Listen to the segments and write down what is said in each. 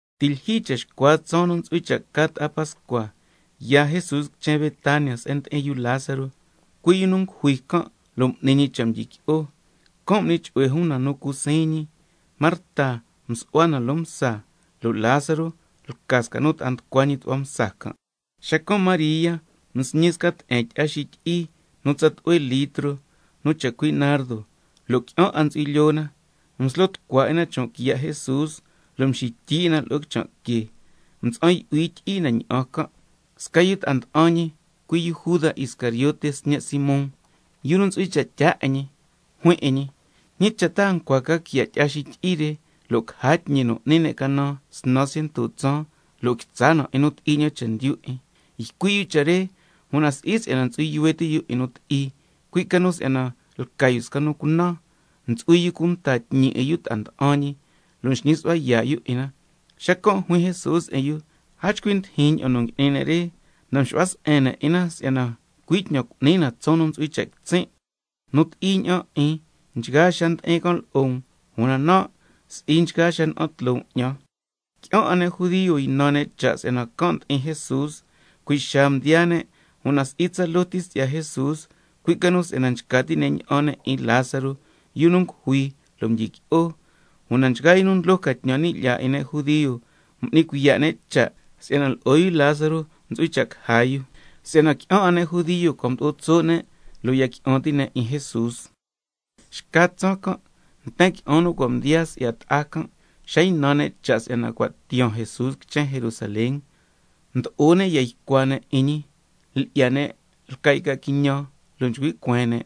Ti' lyijyi cha xcua tsaan nu ntsu'hui cha' ca ta'a Pascua, yaa Jesús quichen Betania se'en ndi'in yu Lázaro, cui' yu nu ngujui can' lo' m'ni ñi cha' mdyiqui'o. Can' m'ni chu'hue jun na nu cu siin ñi. Marta msu'hua na loo msa, lo' Lázaro lca sca nu ta'a nducua ñi tu'hua msa can'. Xacan' María msñi sca te'en tyi'a xityi'i nu tsa tlu'hue litro, nu chacui' nardo, lo' qui'an 'a ntsu'hui lyoo na, mslo tucua 'in na chon' quiya' Jesús, lo' mxityi 'in na lo'o quichan' que, mtsa'an yu'hui tyi'i na ña'an can'. Sca yu ta'a nda'an ñi, cui' yu Juda Iscariote sñe' Simón, yu nu ntsu'hui cha' tyaa 'in ñi, juin 'in ñi: ¿Ñi cha' ta a ncua quiya' tyi'a xityi'i re lo' caja tñi nu n'ni ne' canan snan ciento tsaan, lo' quitsa na 'in nu ti'i ña'an chendyu 'in? Ycui' yu cha' re, una si'i si'yana ntsu'hui yuhue ti' yu 'in nu ti'i, cui' ca nu si'yana lca yu sca nu cunan, lo' ntsu'hui yu cunta tñi 'in yu ta'a nda'an ñi, lo' nxñi su'hua yaa' yu 'in na. Xacan' juin Jesús 'in yu: A chcui ndijin ña'an nu ngui'ni ne' re, na mxu'hua se'en ne' 'in na si'yana cui' tñan cu'ni na tsaan nu ntsu'hui cha' quitsin'. Nu ti'i ña'an 'in, nchgaa xaa ndi'in can' lo'o um, una nan' si'i nchgaa xaa ña'an tloo um 'ñan. Qui'an 'a ne' judio ynan ne' cha' si'yana can' ndi'in Jesús, cui' xaa mdiyaa ne', una si'i tsaloo ti si'ya Jesús, cui' ca nu si'yana nchca ti' ne' ña'an ne' 'in Lázaro, yu nu ngujui lo' mdyiqui'o. Una nchgaa yu nu ndlo ca tñan ni' lyaa 'in ne' judio, m'ni cuiya' ne' cha' si'yana lo'o yu Lázaro ntsu'hui cha' caja yu. Si'ya yu qui'an 'a ne' judio cua' mdo'o tso' ne' lo' ya qui'an ti' ne' 'in Jesús. Xca tsaan can', nten qui'an nu cua' mdiyaa si'ya ta'a can', xa ynan ne' cha' si'yana cua' tiyaan Jesús quichen Jerusalén, mdo'o ne' ya ycua ne' 'in ñi, lyi'ya ne' lca' yca quiñan, lo' nchcui' cueen ne':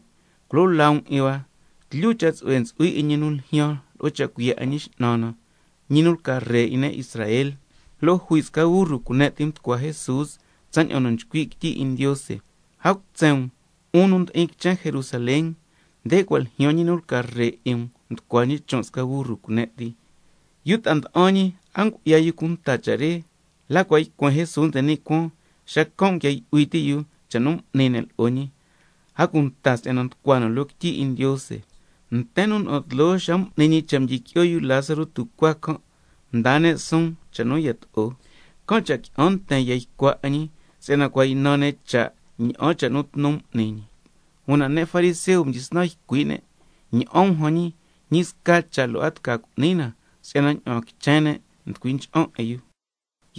—¡Culo laa um 'in hua! Tlyu cha' tsu'hue ntsu'hui 'in ñi nu ljyaan lo'o cha' cuiya' 'in Ñi X'nan na—, ñi nu lca Ree 'in ne' Israel. Lo' jui sca burru cune' ti mducua Jesús tsaña'an nchcui' quityi 'in Ndiose: —A cutsen um, 'un nu ndi'in quichen Jerusalén, nde cua' ljyaan ñi nu lca Ree 'in um, nducua ñi chon' sca burru cune' ti—. Yu ta'a nda'an ñi, a ngu'ya yu cunta cha' re, la cua' ycuen Jesús nde ni' cuaan, xacan' nguia yu'hui ti' yu cha' nu m'ni ne' lo'o ñi si'yana nducua na loo quityi 'in Ndiose. Nten nu na'an tloo xa m'ni ñi cha' mdyiqui'o yu Lázaro tucuaa can', mdaa ne' suun cha' nu yato'o, can' cha' qui'an nten ya ycua 'in ñi, si'yana cua' ynan ne' cha' ña'an cha' nu tnu m'ni ñi. Una ne' fariseo mdyisnan ycui' ne' scasca ne': Ña'an um jan ñi, ñi sca cha' lo' a tca cu'ni na si'yana ña'aan quichen ne' nducui ncha'an 'in yu.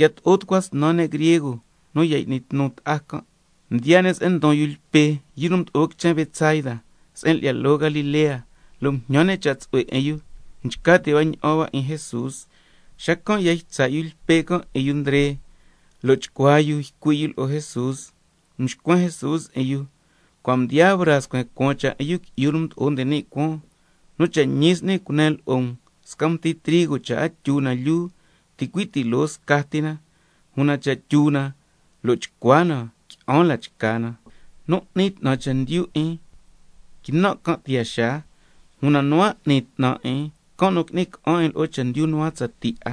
Yato'o tucua snan ne' griego nu ya y'ni tnu ta'a can', mdiyaa ne' se'en ndon yu Lpe, yu mdo'o quichen Betsaida se'en lyi'ya loo Galilea, lo' mjñan ne' cha' tsu'hue 'in yu: Nchca ti' hua ña'an hua 'in Jesús. Xacan' ya ytsa' yu Lpe can' 'in yu Ndre, lo' chcuaa yu ycui' yu lo'o Jesús. Mxcuen Jesús 'in yu: Cua' mdiyaa braa scuen cuaan cha' 'in Yu Qui'yu nu Mdo'o nde ni' Cuaan. Nu cha' ñi s'ni cunen lo'o um, sca mti trigo cha' a tyu na lyuu, ticui' ti loo scati na, una cha' tyu na lo' chcua na, qui'an la chca na. Nu n'ni 'tnan chendyu 'in, quinan' can' tiyaa xaa, una nu a n'ni 'tnan 'in, can' nu qui'ni ca'an 'in lo'o chendyu nu a tsatii 'a.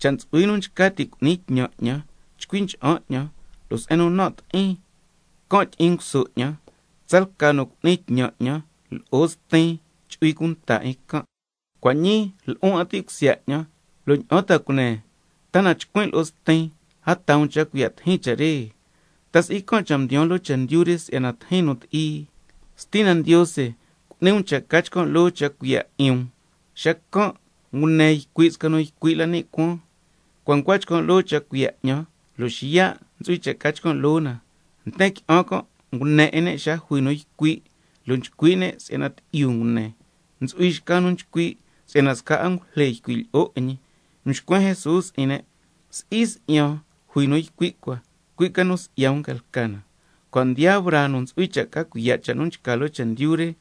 Cha' ntsu'hui nu nchca ti' cu'ni tñan 'ñan, chcui ncha'an 'ñan, lo' se'en nu nan' ti'in, can' tyi'in nguso 'ñan. Tsalca nu cu'ni tñan 'ñan, lo'o Stin chu'hui cunta 'in can'. Cua' ñii lu'un 'a ti' cusya 'ñan, ¿lo' ña'an ta cunen? ¿Ta na chcuin' lo'o Stin, a taa um cha' cuiya' tijin cha' re? ¿Ta si'i can' cha' mdiyaan loo chendyu re si'yana tijin nu ti'i? Stina Ndiose, cu'ni um cha' ca chcan' loo cha' cuiya' 'in um. Xacan' ngune ycui' sca nu ycui' la ni' cuaan: Cua' ncua chcan' loo cha' cuiya' 'ñan, lo' xiya' ntsu'hui cha' ca chcan' loo na. Nten qui'an can' ngune 'in ne' xa jui nu ycui', lo' nchcui' ne' si'yana tyi'yu ngune. Ntsu'hui xca nu nchcui' si'yana sca angujle ycui' lyi'o 'in ñi. Mxcuen Jesús 'in ne': Si'i si'yan jui nu ycui' cua, cui' ca nu si'ya um ca lca na. Cua' mdiyaa braa nu ntsu'hui cha' ca cuiya' cha' nu nchca loo chendyu re,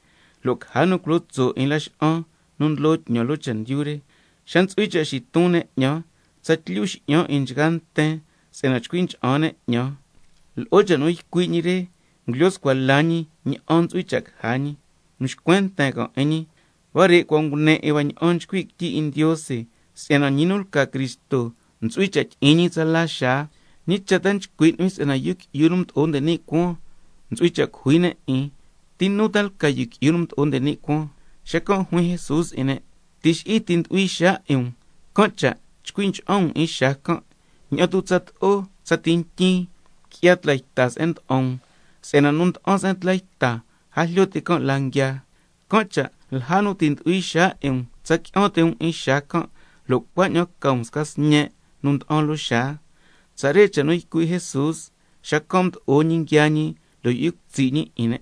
lo' caja nu culo tso' 'in laxa'an nu ndlo tñan loo chendyu re. Xa ntsu'hui cha' xiton ne' 'ñan, tsatlyu xi'yan 'in nchgaa nten si'yana chcui ncha'an ne' 'ñan. Lo'o cha' nu ycui' ñi re, ngulyo scua la ñi ña'an ntsu'hui cha' caja ñi. Mxcuen nten can' 'in ñi: Huare' cua' ngune 'in hua ña'an nchcui' quityi 'in Ndiose si'yana ñi nu lca Cristo ntsu'hui cha' tyi'in ñi tsala xaa. ¿Ñi cha' ta nchcui' nu'huin, si'yana Yu Qui'yu nu Mdo'o nde ni' Cuaan ntsu'hui cha' cujui ne' 'in? ¿Ti nu ta lca Yu Qui'yu nu Mdo'o nde ni' Cuaan? Xacan' juin Jesús 'in ne': Tixi'i ti ti' ndu'hui xaa 'in um, can' cha' chcui ncha'an um 'in xaa can', ña'an tu' tsato'o tsati ntyin qui'ya tla yta se'en nda'an um, si'yana nu nda'an se'en tla yta, a jlyo ti' can' la nguiaa. Can' cha' lja nu ti' ndu'hui xaa 'in um tsa qui'an ti' um 'in xaa can', lo' cuaña'an ca um sca sñe' nu nda'an loo xaa. Tsare cha' nu ycui' Jesús, xacan' mdo'o ñi nguiaa ñi lo' yu'hui cutsi' ñi 'in ne'.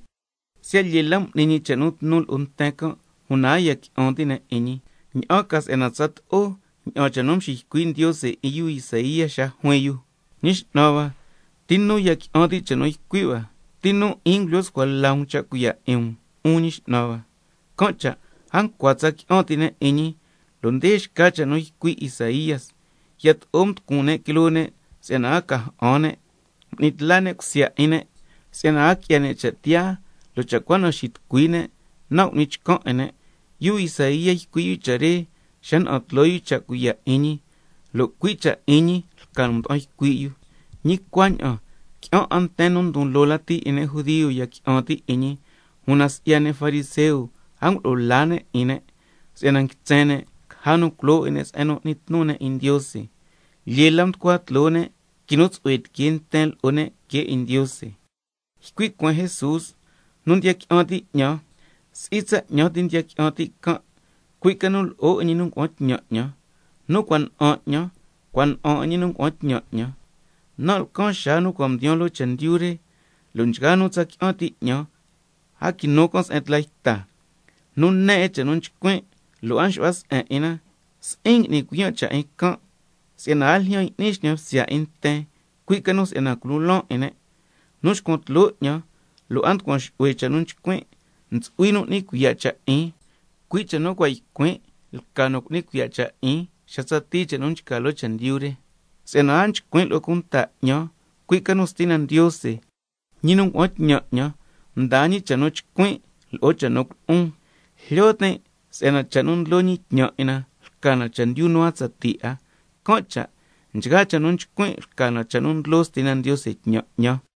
Siya' lyee la m'ni ñi cha' nu tnu tloo nten can', una a ya qui'an ti' ne' 'in ñi, ña'an ca si'yana tsato'o ña'an cha' nu mxiycui' Ndiose 'in yu Isaía xa juin yu: —Ñi X'nan hua, ¿ti nu ya qui'an ti' cha' nu ycui' hua? ¿Ti nu 'in ngulyo scua la um cha' cuiya' 'in um, 'un Ñi X'nan hua—? Can' cha' a ncua tsa qui'an ti' ne' 'in ñi, si'yana nde xca cha' nu ycui' Isaía: —Yato'o mducun ne' quiloo ne' si'yana a ca chcan' 'in ne', m'ni tla ne' cusya 'in ne' si'yana a qui'ya ne' cha' tiyaa, lo' cha' cua na xitucui ne', nan' cu'nin chcan 'in ne'—. Yu Isaía ycui' yu cha' re xa na'an tloo yu cha' cuiya' 'in ñi, lo' cui' cha' 'in ñi lca nu mda'an ycui' yu. Ñi cuaña'an qui'an nten nu ndon loo lati 'in ne' judio ya qui'an ti' 'in ñi, una si'ya ne' fariseo a ngulo'o la ne' 'in ne', si'yana nguitsen ne' caja nu culo 'in ne' se'en nu n'ni tnu ne' 'in Ndiose. Lyee la nducua tloo ne' quinu tsu'hue tiquee nten lo'o ne', que 'in Ndiose. Ycui' cueen Jesús: Nu ndiya qui'an ti' 'ñan, si'i tsa 'ñan tin ndiya qui'an ti' can', cui' ca nu lo'o 'in ñi nu ngua'an tñan 'ñan. Nu cua' na'an 'ñan, cua' na'an 'in ñi nu ngua'an tñan 'ñan. Nan' lcan xaa nu cua' mdiyaan loo chendyu re, si'yana nchgaa nu tsa qui'an ti' 'ñan, a quinu can' se'en tla yta. Nu ne 'in cha' nu nchcuin', lo' a nxu'hua se'en 'in na, si'in cu'ni cuiyan' cha' 'in can', si'yana a ljyan y'nin xñan bsya 'in nten, cui' ca nu si'yana culon laan 'in ne'. Nu nxcuan tloo 'ñan, lo' a nducuan xu'hue cha' nu nchcuin', ntsu'hui xca nu cu'ni cuiya' cha' 'in, cui' cha' nu cua' ycuin' lca nu cu'ni cuiya' cha' 'in, xa tsatii cha' nu nchca loo chendyu re. Si'yana a nchcuin' lo'o cunta 'ñan, cui' ca nu Stina Ndiose, ñi nu ngua'an tñan 'ñan, mdaa ñi cha' nu chcuin', lo'o cha' nu culo'on. Jlyo tin' si'yana cha' nu ndlo ñi tñan 'in na lca na chendyu nu a tsatii 'a, can' cha' nchgaa cha' nu nchcuin' lca na cha' nu ndlo Stina Ndiose tñan 'ñan.